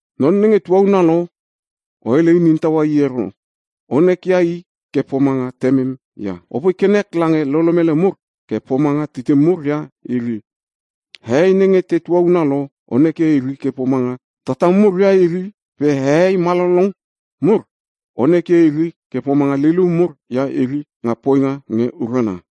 Non nenge tuauna lo, o hele inin taua i ero, onekia i ke pomanga Temem ia. Opoi ke nek lange lolomele mur ke pomanga titim mur ia iri. Hehei nenge te tuauna lo o nekia iri ke pomanga tatam mur ia iri pe hehei malolong mur o nekia iri ke pomanga lilium mur ia iri nga poinga nge urana.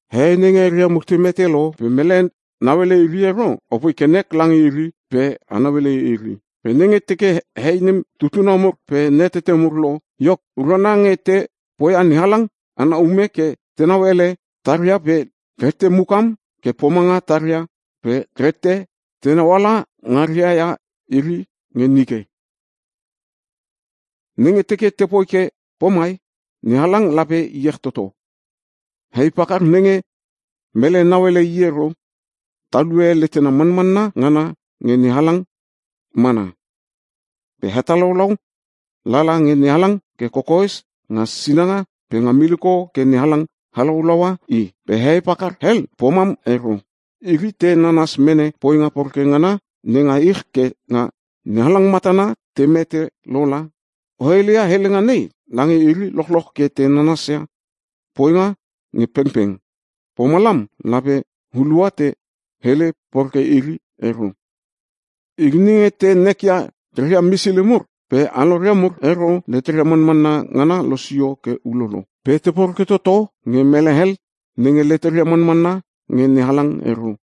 Hehei nenge eria mur te mete lo pe mele nauele iri ero, apoi ke nek lange iri pe a nauele iri. Pe nenge teke hei nem tutuna mur pe natete mur lo, iok urana nge te poia NeHalang ana ume ke tenau ele taria pe reette mukam ke pomanga taria pe reette tenau ala ngaria ia iri nge nike. Nenge teke tepoi ke pomai NeHalang lape iech toto. Hei pakar nenge mele nauele i ero, talue letena manmanna ngana nge NeHalang mana. Pe hetalaulau lala nge NeHalang ke kokoes nga sinanga pe nga miliko ke NeHalang halaulaua i. Pe hei pakar hel pomam ero. Iri te nanas mene poinga poreke ngana nenga ich ke nga NeHalang matana te mete lola. O heleia helenga nei lange iri lochloch ke te nanasia poinga nge pengpeng, pomalam lape hulua te hele poreke iri ero. Iri nenge te nekia reria misili mur pe aloria mur ero, leteria manmanna ngana losio ke ulolo. Pe te poreke toto nge mele hel nenge leteria manmanna nge NeHalang ero.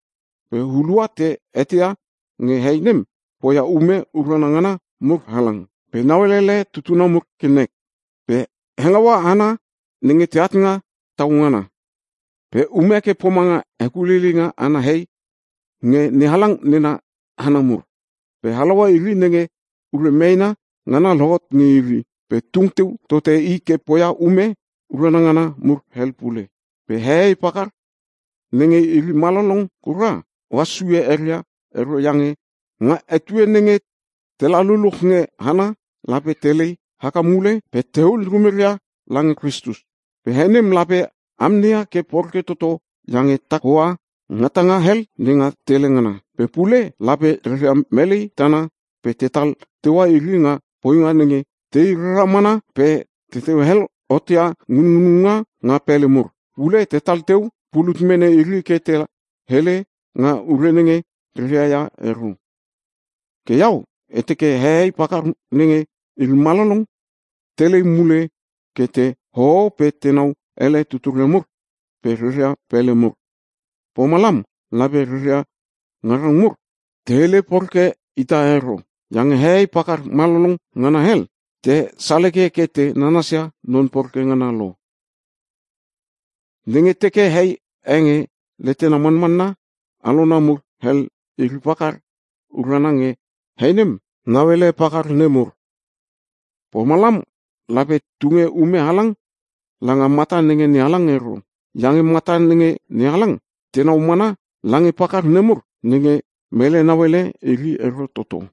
Pe hulua te eteia nge hei nem poia ume urana ngana mur halang. Pe nauelele tutuna mur ke nek. Pe hengaua hana nenge teat nga tau ngana. Pe ume ke pomanga hekuleileinga ana hei nge NeHalang nena hana mur. Pe halaua iri nenge ure meena ngana lohot nge iri. Pe tung teu tote i ke poia ume urana ngana mur hel pule. Pe hehei pakar nenge iri malolong kura, ohas sue eria ero iange nga etue nenge tela luluch nge hana lape telei haka mule pe tehul rumeria lange Kristus. Pe hei nem lape amneia ke poreke toto iange tak hoa ngatanga hel nenga tele ngana. Pe pule lape reria melei tana pe tetal teua iri nga poinga nenge tei rara mana pe teteu hel hotia ngunngununga nga pele mur. Pule tetal teu pulut mene iri ke te hele nga ure nenge reria ia ero. Ke iau e teke hehei pakar nenge iri malolong telei mule ke te hoho pe tenau ele tuturia mur pe reria pele mur. Pomalam lape rera ngarang mur te hele poreke ita ero. Iange hehei pakar malolong ngana hel, te saleke ke te nanasia non poreke ngana lo. Nenge teke hei e nge letena manmanna alona mur hel iri pakar, urana nge hei nem nauele pakar nemur. Pomalam lape tunge ume halang langa mata nenge NeHalang ero. Iange mata nenge NeHalang tenau mana lange pakar nemur nenge mele nauele iri ero toto.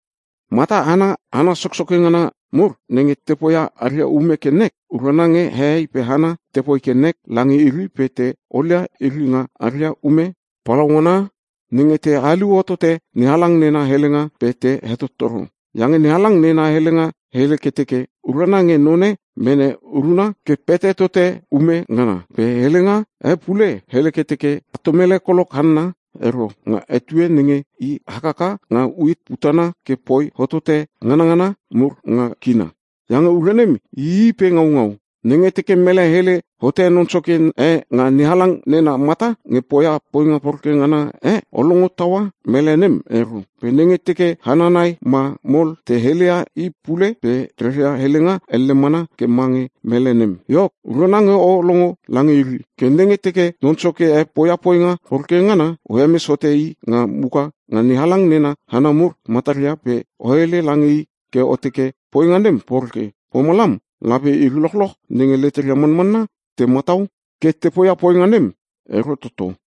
Mata ana hana soksoke ngana mur nenge te poia aria ume ke nek, urana nge hehei pe hana tepoi ke nek lange iri pe te olia iri nga aria ume palaungana nenge te haliu hotote NeHalang nena helenga pe te hetottoro. Iange NeHalang nena helenga hele ke teke, “Urana nge none mene uruna ke pete tote ume ngana.” Pe helenga e pule hele ke teke, “A tom ele kolok hanna ero nga etue nenge i hakaka nga uit putana ke poi hotote nganangana mur nga kina. Iange ure nem ii pe ngaungau.” Nenge teke mele hele hote non soke e nga NeHalang nena mata nge poia poinga poreke ngana e, o longo taua mele nem ero. Pe nenge teke hana nai ma mol te heleia i pule pe reria helenga elle mana ke mange mele nem, iok, urana nge o longo lange iri. Ke nenge teke non soke e poia poinga poreke ngana, o hemes hote i nga muka nga NeHalang nena hana mur mataria pe o hele lange i ke o teke poinga nem poreke. Pomalam lape iri lochlolch nenge leteria manmanna te matau ke te poia poinga nem ero toto.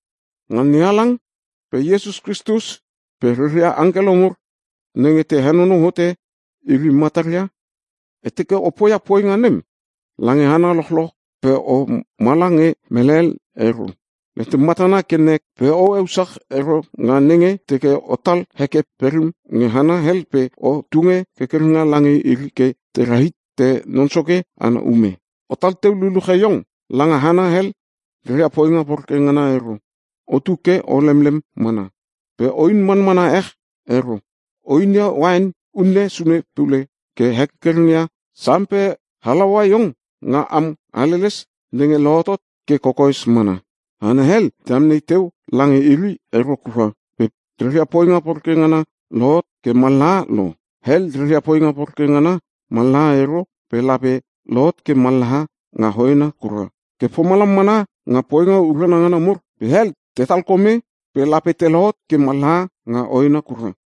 Nga NeHalang pe Iesus Kristus pe reria angkelo mur nenge te henonou hote iri mataria, e teke o poia poinga nem lange hana lochloch pe o mala nge mele hel ero. Letem matana ke nek pe o eusach ero nga nenge teke otal heke perim nge hana hel pe o tunge kerkerenga lange iri ke tera hite Non Soke ana ume. Otal teu luluche iong langa hana hel reria poinga poreke ngana ero, otu ke o lemlem mana. Pe oin manmana ech ero. O inia uain unne sune pule ke hekerkereng ia sam pe halaua iong nga am haleles nenge lohotot ke kokoes mana. Hana hel te amnei teu lange iri ero kura pe reria poinga poreke ngana lohot ke mallaha lo. Hel reria poinga poreke ngana mallaha ero pe lape lohot ke mallaha nga hoena kura. Ke pomalam mana nga poinga urana ngana mur, nge hel mallaha pe hel te talkome pe lape te lohot ke mallaha nga hoena kura.